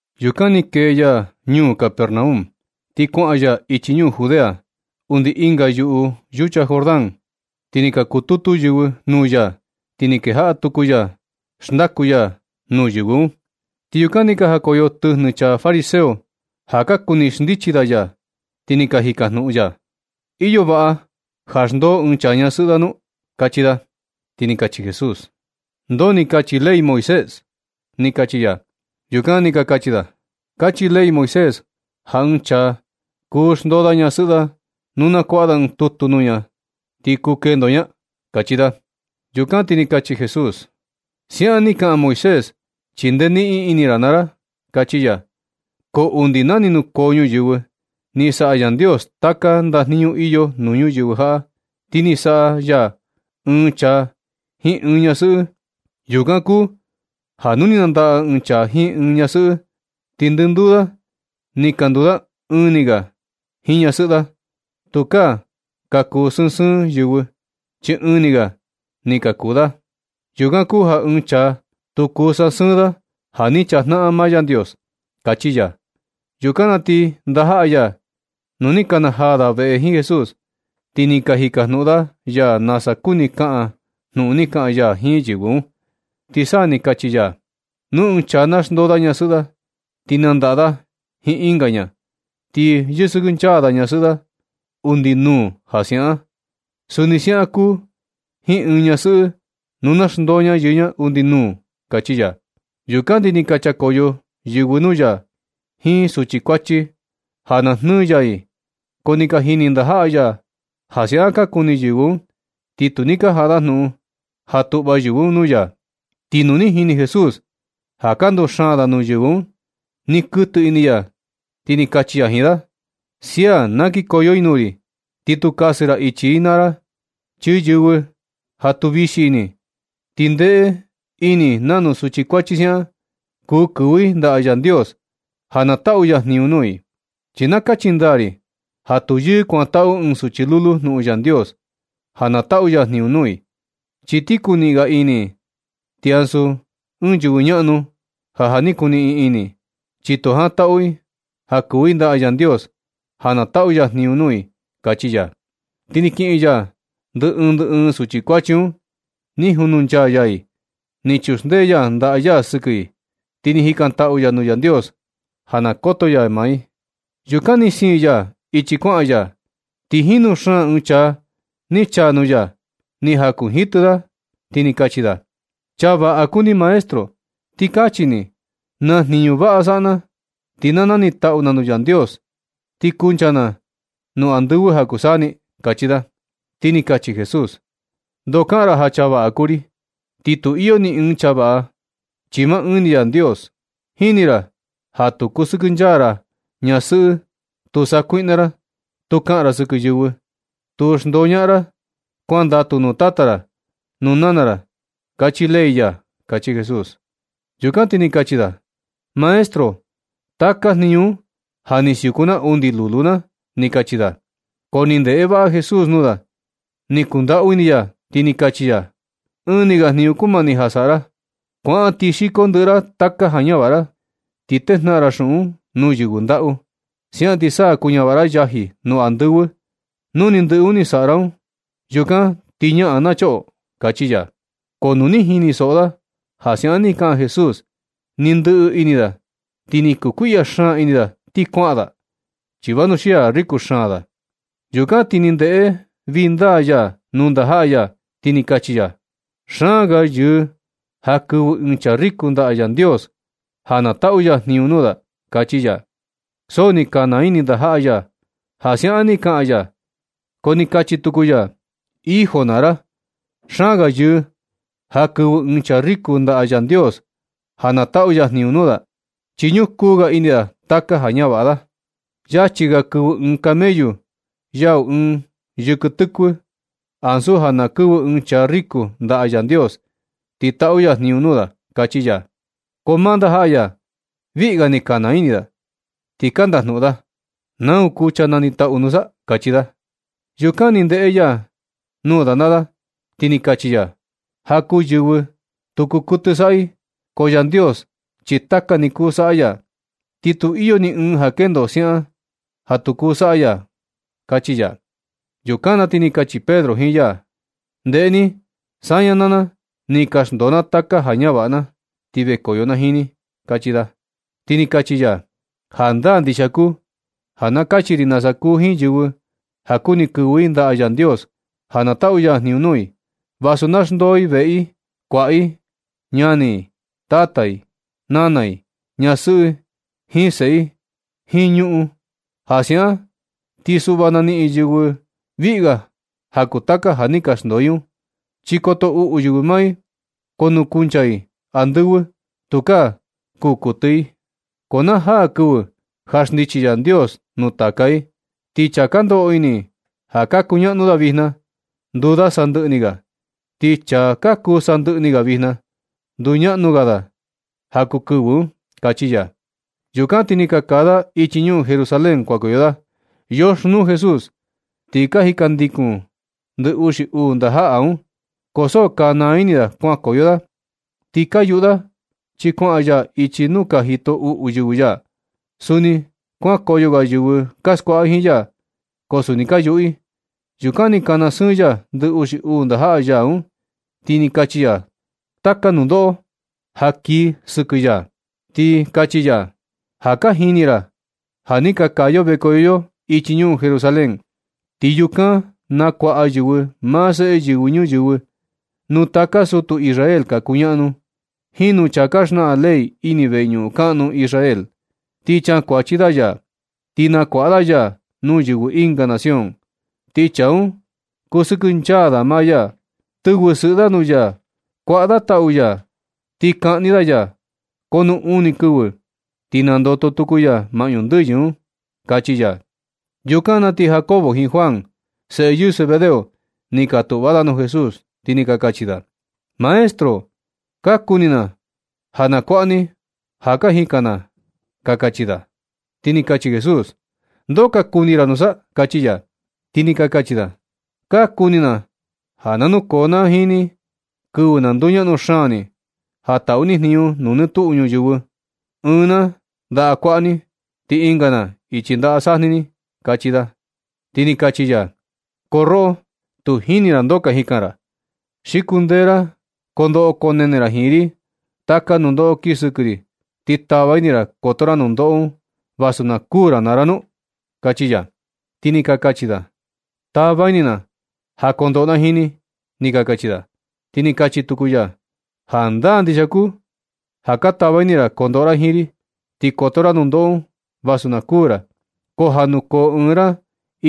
Yukan ni kee ya ñuu Capernaum, ti kuaꞌan ya ichi ñuu Judea undi ɨnga yuꞌu yucha Jordán. Ti ni ka kututu yɨvɨ nuu ya. Ti ni kejaꞌa tuku ya xndaku ya nuu yɨvɨ un. Ti yukan ni ka jakoyo tɨjnɨ chaa fariseo ja ka kuni xndichi da ya, ti ni ka jikajnuꞌun da: ―¿Iyo vaꞌa ja xndoo ɨɨn chaa ñasɨꞌɨ da nu? ―kachi da. Ti ni kachi Jesús: ―¿Ndoo ni kachi ley Moisés? ―kachi ya. Yukan ni ka kachi da: ―Kachi ley Moisés ja ɨɨn chaa kuu xndoo da ñasɨꞌɨ da, nu na kuaꞌa da ɨɨn tutu nuu ña, ti kuu kendo ña ―kachi da. Yukan ti ni kachi Jesús: ―Siaꞌan ni kaꞌan Moisés, chi ndee niꞌin ini ra naa ra, kachi ya. Ko undi na ni nukoo ñuyɨvɨ, ni saꞌa Yandios taka ndajniñu iyo nuu ñuyɨvɨ jaꞌa, ti ni saꞌa ya ɨɨn chaa jiin ɨɨn ñasɨꞌɨ. Yukan kuu ja nu ni nandaꞌa ɨɨn chaa jiin ɨɨn ñasɨꞌɨ, ti ndɨnduu da ni ka nduu da ɨɨn ni ga jiin ñasɨꞌɨ da. Tukaa ka kuu sɨɨn sɨɨn yɨvɨ, chi ɨɨn ni ga ni ka kuu da. Yukan kuu ja ɨɨn chaa, tu kuu sasɨɨn da ja ni chajnaꞌan maa Yandios ―kachi ya. Yukan na ti ndajaꞌa ya, nu ni ka na jaa da veꞌe jiin Jesús, ti ni ka jikajnuꞌun da ya nasa kuni kaꞌan jnuꞌun ni kaꞌan ya jiin yɨvɨ un, ti sa ni kachi ya: ―Nu ɨɨn chaa na xndoo da ñasɨꞌɨ da, ti nandaꞌa da jiin ɨnga ña, ti yɨsɨkɨnchaa da ñasɨꞌɨ da undi nuu ja siaꞌan. Suni siaꞌan kuu jiin ɨɨn ñasɨꞌɨ nu na xndoo ña yɨɨ ña undi nuu ―kachi ya. Yukan ti ni ka chakoyo yɨvɨ nuu ya jiin suchi kuachi ja na jnɨɨ ya i. Ko ni ka jini ndajaꞌa ya ja siaꞌan ka kuni yɨvɨ un, ti tu ni ka jaꞌa da jnuꞌun ja tuꞌva yɨvɨ un nuu ya. Ti nu ni jini Jesús ja ka nduxaan da nuu yɨvɨ un, ni kuɨtɨ ini ya, ti ni kachi ya jiin da: ―Sia, na kikoyo i nuu ri, ti tu kasɨ ra ichi i naa ra. Chi yɨvɨ ja tu vixi ini, ti ndeꞌe ini i nanu suchi kuachi siaꞌan, kuu kɨvɨ i ndaꞌa Yandios ja na taꞌu ya jniñu nuu i. Chi na kachi ndaa ri ja tu yɨɨ kuantaꞌu ɨɨn suchi lulu jnuꞌun Yandios ja na taꞌu ya jniñu nuu i, chi ti kuniꞌin ga ini i, ti ansu ɨɨn yɨvɨ ñaꞌnu ja, ja ni kuniꞌin ini, chi tu jantaꞌu i ja kɨvɨ i ndaꞌa Yandios ja na taꞌu ya jniñu nuu i ―kachi ya. Ti ni kiꞌin ya ndɨ ɨɨn ndɨ ɨɨn suchi kuachi un, ni jununchaa ya i, ni chuxndee ya ndaꞌa ya sɨkɨ i, ti ni jikantaꞌu ya nuu Yandios ja na koto ya i. Yukan ni siin ya ichi kuaꞌan ya, ti jinu xaan ɨɨn chaa ni chaa nuu ya. Ni jakunjitɨ da, ti ni kachi da: ―Chaa vaꞌa kuu ni maestro. Ti kachi ni, ¿naa jniñu vaꞌa saꞌa na, ti na ni taꞌu na nuu Yandios, ti kuncha na nuu andɨvɨ ja kuu saa ni? ―kachi da. Ti ni kachi Jesús: ―Ndoo kaꞌan ra ja chaa vaꞌa kuu ri, ti tu iyo ni ɨɨn chaa vaꞌa, chi maa ɨɨn ni Yandios. Jini ra ja tu kusɨkɨnchaa ra ñasɨꞌɨ, tu sakuiꞌna ra, tu kaꞌan ra sɨkɨ yɨvɨ, tu xndoñaꞌan ra, kuandatu nuu tata ra nuu nana ra, kachi ley ya ―kachi Jesús. Yukan ti kachi da: ―Maestro, taka jniñu un ja ni siuku na undi lulu na ―ni kachi da. Ko ni ndeꞌe vaꞌa Jesús nuu da, ni kundaꞌau ini ya, ti ni kachi ya: ―Ɨɨn ni ga jniñu kumani ja saꞌa ra. Kuaꞌan ti xiko ndɨꞌɨ ra taka ja ñavaꞌa ra, ti tejnaꞌan xuꞌun un nuu yɨvɨ ndaꞌu. Siaꞌan ti sa kuñavaꞌa ra yaji nuu andɨvɨ. Nu ni ndɨꞌɨ ni saꞌa ra un, yukan ti ñaꞌan na choꞌo ―kachi ya. Ko nu ni jinisoꞌo da ja siaꞌan ni kaꞌan Jesús, ni ndɨꞌɨ ini da, ti ni kukuiꞌya xaan ini da ti kuaꞌan da, chi vanuxia riko xaan da. Yukan ti ni ndeꞌe vindaa ya nuu ndajaꞌa ya, ti ni kachi ya: ―Xaan ga yɨɨ ja kɨvɨ ɨɨn chaa riko ndaꞌa Yandios ja na taꞌu ya jniñu nuu da ―kachi ya. So ni ka naa ini ndajaꞌa ya ja siaꞌan ni kaꞌan ya. Ko ni kachi tuku ya: ―Hijo naa ra, xaan ga yɨɨ ja kɨvɨ ɨɨn chaa riko ndaꞌa Yandios ja na taꞌu ya jniñu nuu da, chi ñukuu ga ini da taka ja ñavaꞌa da. Yachi ga kɨvɨ ɨɨn camellu yau ɨɨn yɨkɨ tɨkuɨ, ansu ja na kɨvɨ ɨɨn chaa riko ndaꞌa Yandios ti taꞌu ya jniñu nuu da ―kachi ya. Ko maa ndajaꞌa ya, viꞌga ni ka naa ini da, ti ka ndajnuꞌun da: ―¿Nau kuu chaa nanitaꞌu nusa? ―kachi da. Yukan ni ndeꞌe ya nuu da naa da, ti ni kachi ya: ―Ja kuu yɨvɨ, tu kuu kuɨtɨ saꞌa i, ko Yandios chi taka ni kuu saꞌa ya, ti tu iyo ni ɨɨn ja kendo siaꞌan ni ja tu kuu saꞌa ya ―kachi ya. Yukan na ti ni kachi Pedro jiin ya: ―Ndeꞌe ni, saña naa na, ni ka xndoo na taka ja ka ñavaꞌa na, ti vekoyo na jiin ni ―kachi da. Ti ni kachi ya: ―Jandaa ndixia kuu ja na kachi ri nasa kuu jiin yɨvɨ ja kuni kɨvɨ i ndaꞌa Yandios ja na taꞌu ya jniñu nuu i, vasu na xndoo i veꞌe i, kuaꞌa i, ñani i, tata i, nana i, ñasɨꞌɨi jiin seꞌe i jiin ñuꞌun i. Ja siaꞌan ti suꞌva na niꞌin yɨ viꞌga ja kuu taka ja ni ka xndoo i un. Chi koto uꞌu yɨvɨ maa i, ko nuu kuncha i andɨvɨ, tukaa kuu kuɨtɨ i. Ko na jaa kɨvɨ ja xndichi Yandios nuu taka i, ti chaa ka ndoꞌo ini ja ka kuñaꞌnu da vijna, nduu da sandɨꞌɨ ni ga. Ti chaa ka kuu sandɨꞌɨ ni ga vijna, nduu ñaꞌnu ga da ja kuu kɨvɨ un ―kachi ya. Yukan ti ni ka kaa da ichi ñuu Jerusalén kuankoyo da. Yoxnuu Jesús, ti ka jindandikun ndɨ uxi uu ndajaꞌa un, ko so ka naa ini da kuankoyo da ti ka yuꞌu da, chi kuaꞌan ya ichi nuu ka jito uꞌu yɨvɨ ya. Suni kuankoyo ga yɨvɨ ka skuaꞌa jiin ya, ko suni ka yuꞌu i. Yukan ni kana sɨɨn ya ndɨ uxi uu ndajaꞌa ya un, ti ni kachi ya taka nundoꞌo ja kii sɨkɨ ya. Ti kachi ya: ―Ja ka jini ra ja ni ka kaa yo vekoyo yo ichi ñuu Jerusalén. Ti yukan nakuaꞌa yɨvɨ maa Seꞌe Yɨvɨ Ñuyɨvɨ nuu taka sutu Israel ka kuñaꞌnu, jiin nuu chaa ka xnaꞌan ley ini veñuꞌun kaꞌnu Israel. Ti chakuachi da ya, ti nakuaꞌa da ya nuu yɨvɨ ɨnga nación. Ti chaa un kusɨkɨnchaa da maa ya, tɨvɨ sɨꞌɨ da nuu ya, kuaꞌa da tau ya, ti kaꞌni da ya. Ko nu uni kɨvɨ, ti nandoto tuku ya maꞌñu ndɨyɨ un ―kachi ya. Yukan na ti Jacobo jiin Juan, seꞌe yɨɨ Zebedeo, ni ka tuꞌva da nuu Jesús ti ni ka kachi da: ―Maestro, ka kuni na ja kuaꞌa ni ja ka jikan va ―ka kachi da. Ti ni kachi Jesús: ―¿Ndoo ka kuni ra nusa? ―kachi ya. Ti ni ka kachi da: ―Ka kuni na ja na nukoo na jiin ni kɨvɨ na nduñaꞌnu xaan ni, ja taꞌu ni jniñu nuu nɨ tuꞌu ñuyɨvɨ, ɨɨn na ndaꞌa kuaꞌa ni, ti ɨnga na ichi ndaꞌa sajni ni ―kachi da. Ti ni kachi ya: ―Ko roꞌo, tu jini ra ndoo ka jikan ra, ¿xi kundee ra koo ndoꞌo koo nene ra jiin ri taka nundoꞌo kii sɨkɨ ri, ti tava ini ra koto ra nundoꞌo un, vasu na kuū ra naa ra nu? ―kachi ya. Ti ni ka kachi da: ―Tava ini na ja kondoꞌo na jiin ni ―ni ka kachi da. Ti ni kachi tuku ya: ―Jandaa ndixia kuu ja ka tava ini ra kondoꞌo ra jiin ri, ti koto ra nundoꞌo un vasu na kuu ra. Ko ja nukoo ɨɨn ra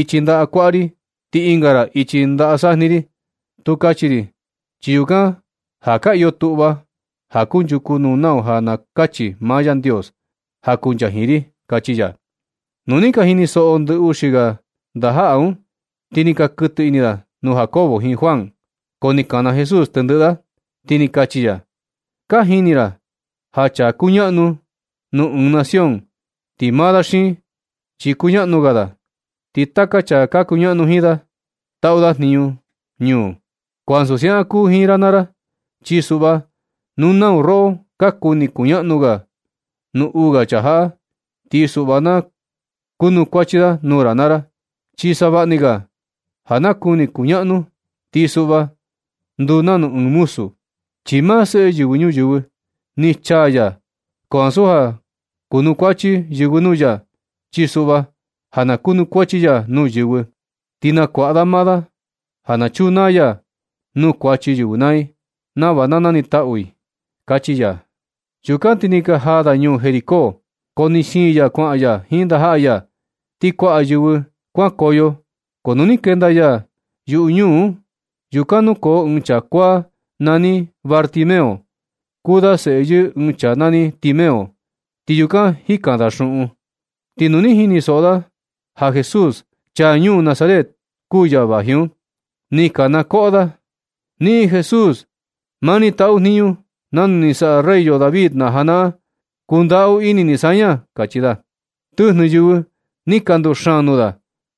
ichi ndaꞌa kuaꞌa ri ti ɨnga ra ichi ndaꞌa sajni, tu kachi ri, chi yukan ja ka iyo tuꞌva ja kunchuku nu nau ja na kachi maa Yandios ja kuncha jiin ri ―kachi ya. Nu ni ka jinisoꞌo ndɨ uxi ga ndajaꞌa un, ti ni ka kɨtɨ ini da nuu Jacobo jiin Juan. Ko ni kana Jesús tendɨꞌɨ da, ti ni kachi ya: ―Ka jini ra ja chaa kuñaꞌnu nuu ɨɨn nación, ti maa da xiin, chi kuñaꞌnu ga da, ti taka chaa ka kuñaꞌnu jiin da, taꞌu da jinñu nuu. Ko ansu siaꞌan kuu jiin ra naa ra. Chi suꞌva, nu nau roꞌo ka kuni kuñaꞌnu ga nuu uu ga chaa jaꞌa, ti suꞌva na kuanukuachi da nuu ra naa ra. Chi savaꞌni ga ja na kuni kuñaꞌnu, ti suꞌva nduu nanu ɨɨn muzu. Chi maa Seꞌe Yɨvɨ Ñuyɨvɨ, ni chaa ya, ko ansu ja kunukuachi yɨvɨ nuu ya, chi suꞌva ja na kunukuachi ya nuu yɨvɨ. Ti nakuaꞌa da maa ya ja na chunaa ya nuu kuachi yɨvɨ naa i, nava na nanitaꞌu i ―kachi ya. Yukan ti ni ka jaa da ñuu Jericó. Ko ni siin ya kuaꞌan ya jiin ndajaꞌa ya, ti kuaꞌa yɨvɨ kuankoyo. Ko nu ni kenda ya yuꞌu ñuu un, yukan nukoo ɨɨn chaa kuaa nani Bartimeo, kuu da seꞌe yɨɨ ɨɨn chaa nani Timeo, ti yukan jikan da xuꞌun. Ti nu ni jinisoꞌo da ja Jesús, chaa ñuu Nazaret, kuu ya vaji un, ni kanakoꞌo da: ―¡Niꞌin Jesús! ¡Maa ni taꞌu jniñu nanu ni saꞌa rey yo David na janaꞌan, kundaꞌu ini ni saña! ―kachi da. Tɨjnɨ yɨvɨ ni ka nduxaan nuu da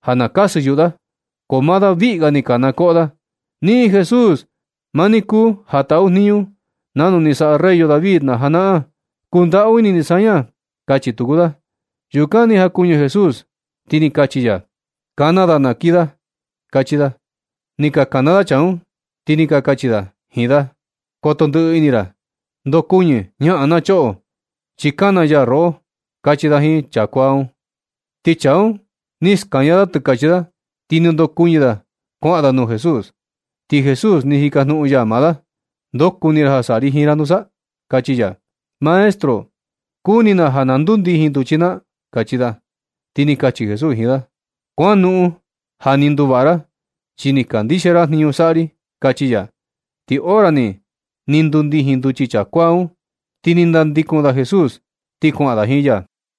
ja na kasɨ yuꞌu da, ko maa da viꞌga ni kanakoꞌo da: ―¡Niꞌin Jesús! ¡Maa ni kuu ja taꞌu jniñu nanu ni saꞌa rey yo David na janaꞌan, kundaꞌu ini ni saña! ―kachi tuku da. Yukan ni jakuɨñɨ Jesús, ti ni kachi ya: ―Kana da na kii da ―kachi ya. Ni ka kana da chaa un, ti ni ka kachi da jiin da: ―Koto ndɨꞌɨ ini ra. Ndokuɨñɨ, ñaꞌan na choꞌo, chi kana ya roꞌo ―kachi da jiin chaa kuaa un. Ti chaa un ni skaña da tɨkachi da, ti ni ndokuɨñɨ da kuaꞌan da nuu Jesús. Ti Jesús ni jikajnuꞌun ya maa da: ―¿Ndoo kuni ra ja saꞌa ri jiin ra nusa? ―kachi ya. ―Maestro, kuni na ja na ndundijin nduchi na ―kachi da. Ti ni kachi Jesús jiin da: ―Kuanoꞌon, ja ni nduvaꞌa ra, chi ni kandixia ra jniñu saꞌa ri ―kachi ya. Ti hora ni, ni ndundijin nduchi chaa kuaa un, ti ni nandikun da Jesús, ti kuaꞌan da jiin ya.